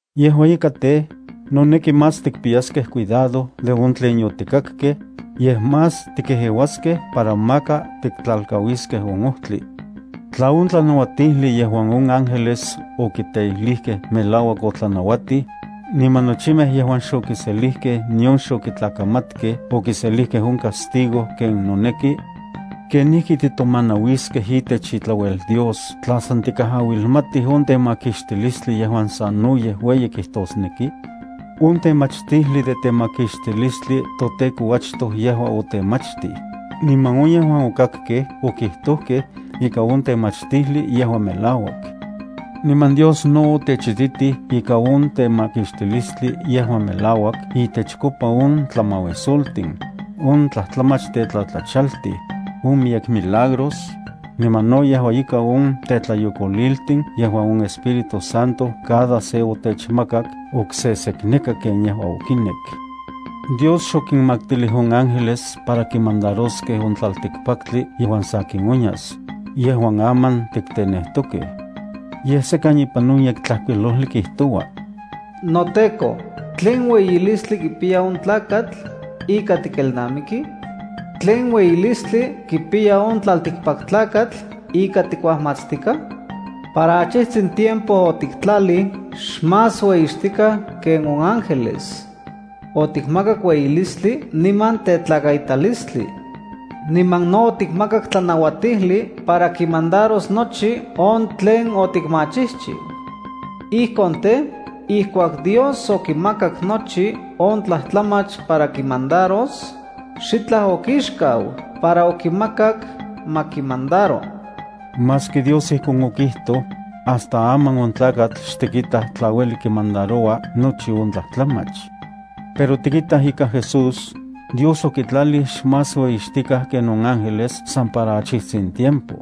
Yejua ika tej, noneki más tikpiyaskej cuidado de on tlen yotikakej, yej más tikejeuaskej para maka tiktlalkauiskej on ojtli. Tla on tlanauatijli yejuan on ángeles okiteijlijkej melauak otlanauatij, niman nochimej yejuan xokiselijkej nion xokitlakamatkej okiselijkej on castigo ken noneki, ¿kenijki titomanauiskej itech itlauel Dios tla san tikajauilmatij on temakixtilistli yejuan sanoyej ueyi kijtosneki? On temachtijli de temakixtilistli toTEKO achtoj yejua otemachtij, niman on yejuan okakkej okitojkej ika on temachtijli yejua melauak. Niman Dios no otechititij ika on temakixtilistli yejua melauak itechkopa on tlamauisoltin, on tlajtlamach tetlatlachaltij, on miyek milagros, niman no yejua ika on tetlayokoliltin yejuan on Espíritu Santo cada se otechmakak oksesekneka ken yejua okinek. Dios xokinmaktilij on ángeles para kimandaroskej on tlaltikpaktli yejuan sakin onyas, yejuan aman tiktenejtokej. Yej sekan ipan on Yektlajkuilojli kijtoua: NoTEKO, ¿tlen ueyilistli kipiya on tlakatl, ika tikelnamiki? ¿Tlen ueyilistli kipiya on tlaltikpaktlakatl ika tikuajmatstikaj? Para achitsin tiempo otiktlalij xmás ueyixtikaj ken on ángeles. Otikmakak ueyilistli niman tetlakaitalistli. Niman no otikmakak tlanauatijli para kinmandaros nochi on tlen otikmachijchiu. Ijkon tej, ijkuak Dios okimakak nochi on tlajtlamach para kimandaros, xitlaj okixkau para okimakak ma kimandaro. Maski Dios ijkon okijtoj, hasta aman on tlakatl xtikitaj tla ueli kimandaroua nochi on tlajtlamach. Pero tikitaj ika Jesús, Dios okitlalij xmás ueyixtikaj ken on ángeles san para achijtsin tiempo.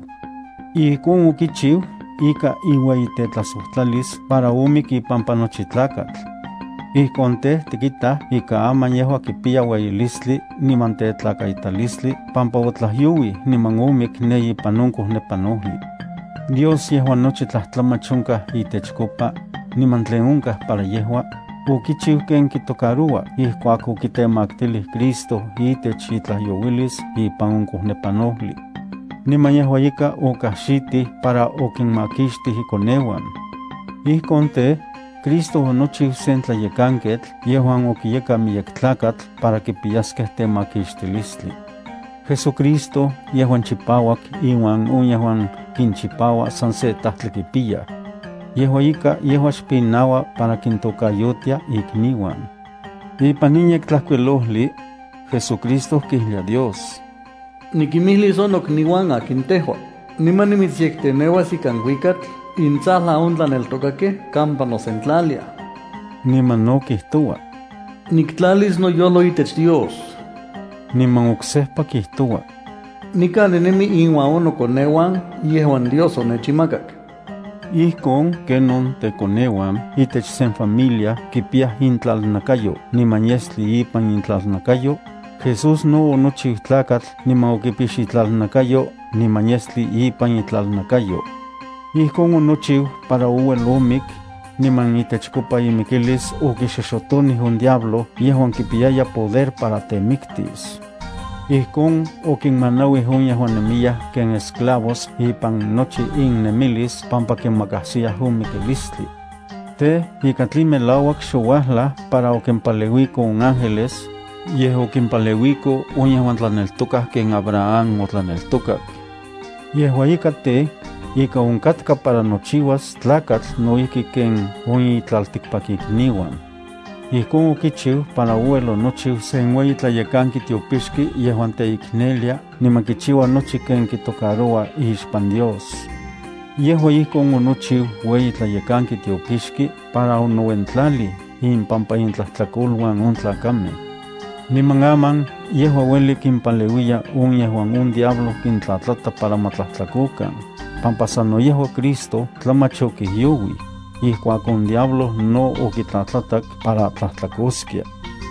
Ijkon okichiu ika iueyitetlajsojtlalis para omik ipampa nochi tlakatl. Ijkon tej, tikitaj ika aman yejua kipiya ueyilistli niman tetlakaitalistli pampa otlajyouij niman omik ne ipan on kojnepanojli. Dios yejuan nochi tlajtlamach onkaj itechkopa, niman tlen onkaj para yejua, okichiu ken kitocaroua ijkuak okitemaktilij Cristo itech itlajyouilis ipan on kojnepanojli. Niman yejua ika okaxitij para okinmakixtij ikoneuan. Ijkon tej, Cristo onochiu sen tlayekanketl yejuan okiyekan miyek tlakatl para kipiyaskej temakixtilistli. JesuCristo yejuan chipauak iuan on yejuan kinchipaua san se Tajtli kipiyaj. Yejua ika, yejua xpinaua para kintokayotia ikniuan. Ipan in Yektlajkuilojli JesuCristo kijlia Dios: Nikimijlis on nokniuan akin tejua. Niman nimitsyekteneuas ikan kuikatl intsajlan on tlaneltokakej kampa nosentlaliaj. Niman no kijtoua: Niktlalis noyojlo itech Dios. Niman oksejpa kijtoua: Nikan ninemi inuan on nokoneuan yejuan Dios onechinmakak. Ijkon ken on tekoneuan itech sen familia kipiyaj nakatl niman yestli ipan intlalnakayo, Jesús no onochiu tlakatl niman okipix nakatl niman yestli ipan itlalnakayo. Ijkon onochiu para ouel omik, niman itechkopa imikilis okixoxotonij on diablo yejuan kipiyaya poder para temiktis. Ijkon okinmanauij on yejuan nemiyaj ken esclavos ipan nochi innemilis pampa kimakajsiyaj on mikilistli. Tej, ika tlen melauak xouajlaj para okimpaleuiko on ángeles, yej okimpaleuiko on yejuan tlaneltokaj ken Abraham otlaneltokak. Yejua ika tej, ika onkatka para nochiuas tlakatl no ijki ken on itlaltikpakikniuan. Ijkon okichiu para ouel onochiu sen ueyi tlayekanki tiopixki yejuan teiknelia niman kichiua nochi ken kitocaroua ixpan Dios. Yejua ijkon onochiu ueyi tlayekanki tiopixki para onouentlalij impampa intlajtlakoluan on tlakamej. Niman aman yejua ueli kimpaleuiya on yejuan on diablo kintlatlata para ma tlajtlakokan, pampa sano yejua Cristo tlamach okijyouij, ijkuak on diablo no okitlatlatak para tlajtlakoskia.